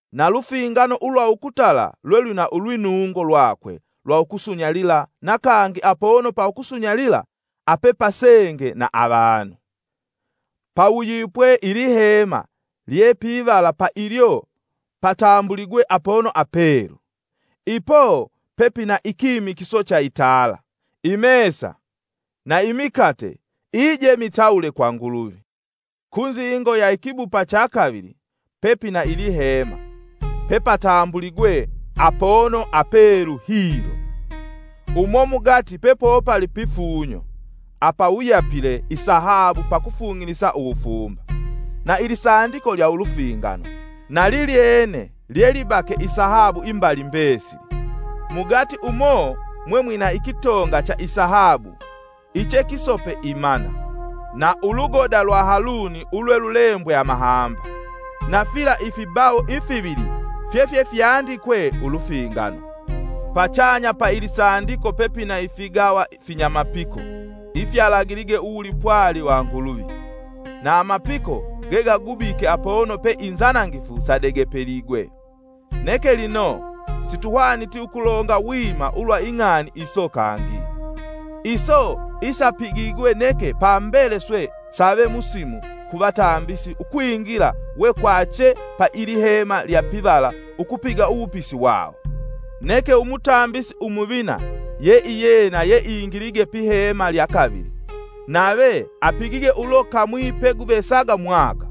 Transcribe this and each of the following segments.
Nalufingano ulwa ukutala lwe lwina ulwinungo lwakwe lwa ukusunyalila na kangi apono pa ukusunyalila apepasenge na avanu. Pawuyipwe ilihema lye pivala pailyo patambuligwe apono apelu. Ipo pepina ikimikiso cha itala, imesa na imikate ijemitawule kwa Nguluvi. Kunzingo ya ikibupa cha kavili, pepina ilihema pepatambuligwe Apono Apelu Hilo. Umo mugati pepopali pifunyo apawuyapile isahabu pakufung'ilisa uwufumba, na ilisandiko lya ulufingano, na lilyene lyelibake isahabu imbali mbesili, mugati umo mwemwina ikitonga cha isahabu ichekisope imana, na ingoda ya Haluni yeyeyilembwe amahamba, na fila ifibawo ifivili fyefyefyandikwe Ulufingano, pachanya pa ilisandiko pepina ifigawa finyamapiko ifyalagilige uwulipwali wa Nguluvi, na amapiko gegagubike apono pe inzanangifu sadegepiligwe. Neke lino, situhwaniti ukulonga wima ulwa ing'ani iso kangi. Iso isapigigwe neke pambele swe save musimu ku vatambisi ukwingila wekwache pa ilihema lya pivala ukupiga uwupisi wawo. Neke umutambisi umuvina yeiyena yeingilige pihema lya kavili, nave apigige ulo kamwi peguvesaga mwaka.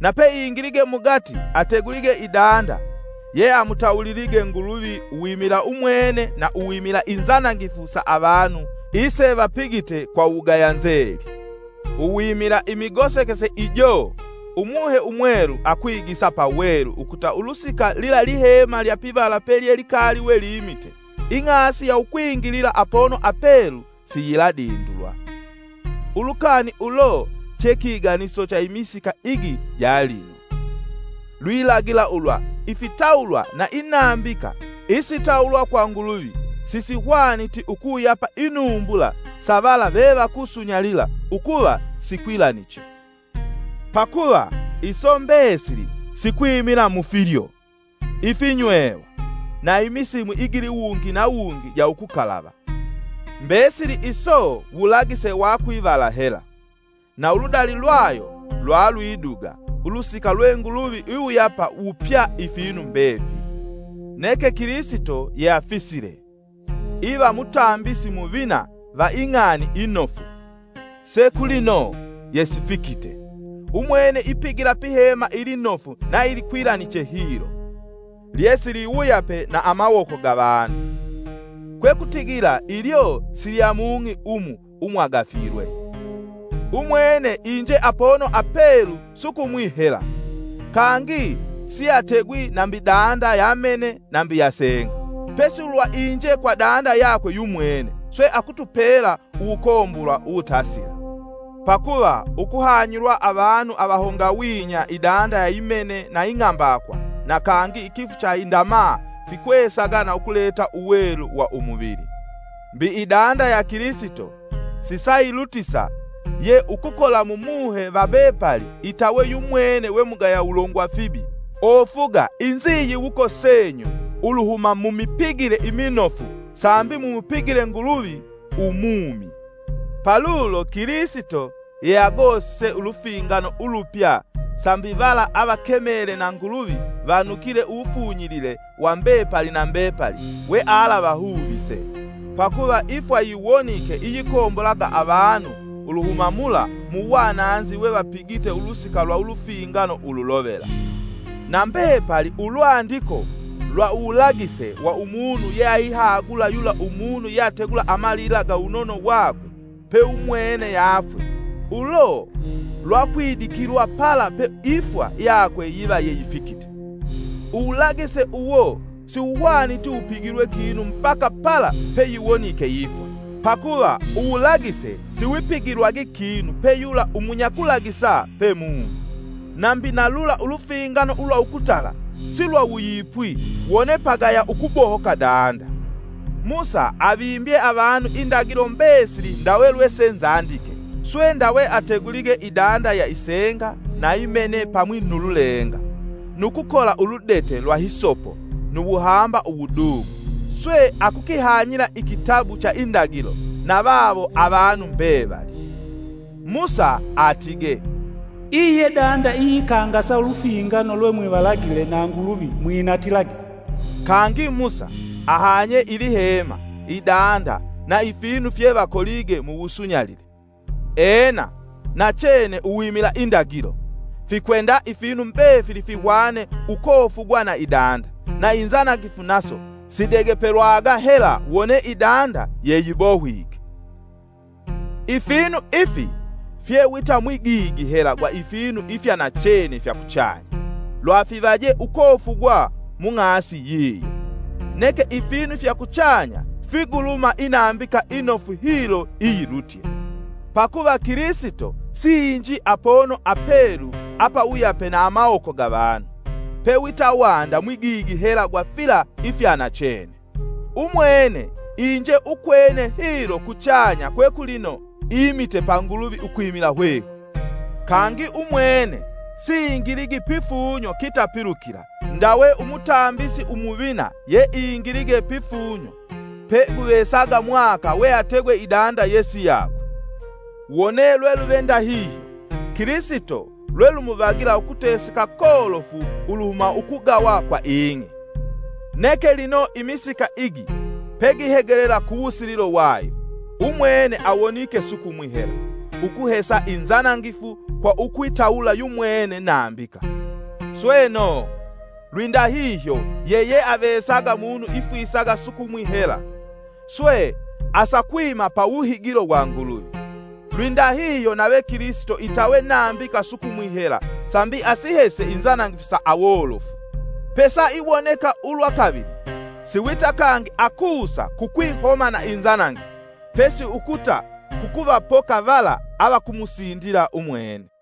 Na peingilige mugati ategulige idanda yeamutawulilige Nguluvi uwimila umwene na uwimila inzanangifu sa avanu isevapigite kwa uwugaya nzeli. Uwimila imigosekese ijo Umuhe Umwelu akwigisa pawelu ukuta ulusika lila lihema lya pivala pelye likali we limite, ing'asi ya ukwingilila Apono Apelu siyiladindulwa. Ulukani ulo che kiganiso cha imisika igi ja lino. Lwilagila ulwa ifitawulwa na inambika isitawulwa kwa Nguluvi sisihwaniti ukuwuyapa inumbula sa vala vevakusunyalila ukuva sikwilaniche. Pakuva iso mbesili sikwimila mu filyo, ifinywewa na imisimu igiliwungi na wungi ja ukukalava. Mbesili iso wulagise wa kwivala hela; na uludali lwayo lwalwiduga ulusika lwe Nguluvi iwuyapa wupya ifinu mbefili. Neke Kilisito yeafisile, iva Mutambisi Muvina va ing'ani inofu, se kulino yesifikite, umwene ipigila pihema ilinofu na ilikwilaniche hilo, lyesiwuyape na amawoko ga vanu, kwekutigila ilyo silya mung'i umu umwagafilwe. Umwene inje Apono Apelu sukumwi hela, kangi sieategwi nambi danda ya mene nambi ya senga, pesi ulwa inje kwa danda yakwe yumwene, swe akutupela uwukombolwa uwutasila. Pakuva ukuhanyilwa avanu avahongawinya idanda ya imene na ing'ambakwa na kangi ikifu cha indamaa fikwesaga na ukuleta uwelu wa umuvili. Mbi idanda ya Kilisito, sisailutisa ya ukukola mu muhe va mbepali itawe yumwene we mugaya wulongwa fibi ofuga inziyiwuko senyu uluhuma mumipigile iminofu sambi mumupigile Nguluvi umumi. Palulo Kilisito, yeagosise Ulufingano ulupya sambi vala avakemele na Nguluvi vanukile uwufunyilile wa mbepali na mbepali wealavahuvise, pakuva ifwa yiwonike iyikombolaga avanu uluhuma mula mu wananzi wevapigite ulusika lwa ulufingano ululovela. Na mbepali ulwandiko lwa uwulagise wa umunu yeaihagula yula umunu yategula amalila ga uwunono wakwe paumwene yaafwe, ulo lwakwidikilwa pala pe ifwa yakwe yiva yeyifikite. Uwulagise uwo siwuhwaniti wupigilwe kinu mbaka pala peyiwonike ifwa, pakuva uwulagise siwipigilwagi kinu pe yula umunyakulagisa pe mumi. Nambi na lula ulufingano ulwa ukutala silwawuyipwi wone pagaya ukubohoka danda. Musa avimbye avanu indagilo mbesili ndawe lwesenzandike swe ndawe ategulige idanda ya isenga na imene pamwi nu lulenga, nu kukola uludete lwa hisopo nu wuhamba uwudung'u, swe akukihanyila ikitabu cha indagilo na vawo avanu mbevali. Musa atige, “Iyi ye danda iyikangasa ulufingano lwe mwivalagile na Nguluvi mwinatilage.” Kangi Musa ahanye ilihema idanda na ifinu fyevakolige muwusunyalile. Ena, nachene uwimila indagilo, fikwenda ifinu mbefili fihwane ukofugwa na idanda, na inzanangifu naso sidegepelwaga hela wone idanda yeyibohwike. Ifinu ifi fye wita mwigigi hela gwa ifinu ifya nachene fya kuchanya, lwafivaje ukofugwa mung'asi yiyo. Neke ifinu fya kuchanya sifiguluma inambika inofu hilo iyilutye. Pakuva Kilisito siinji Apono Apelu apawuyape na amawoko ga vanu, pe wita wanda mwigigi hela gwa fila ifyanachene. Umwene iinje ukwene hilo kuchanya kwe kulino imite pa Nguluvi ukwimila hwehwe. Kangi umwene siingiligi pifunyo kitapilukila ndawe umutambisi umuvina yeingilige pifunyo peguvesaga mwaka weategwe idanda yesiyakwe. wone lweluve ndahihyo, Kilisito lwelumuvagila ukuteseka kolofu uluhuma ukugawa kwa ing'i. Neke lino imisika igi pegihegelela kuwusililo wayo, umwene awonike sukumwi hela, ukuhesa inzanangifu kwa ukwitawula yumwene nambika. Sweno, lwindahihyo yeyeavesaga munu ifwisaga sukumwi hela, swe asakwima pa wuhigilo wa Nguluvi, lwindahihyo nave Kilisito itawe nambika sukumwi hela sambi asihese inzanangifu sa awolofu. Pesaiwoneka ulwa kavili, siwita kangi akusa kukwihoma na inzanangifu, pesi ukuta kukuvapoka vala avakumusindila umwene.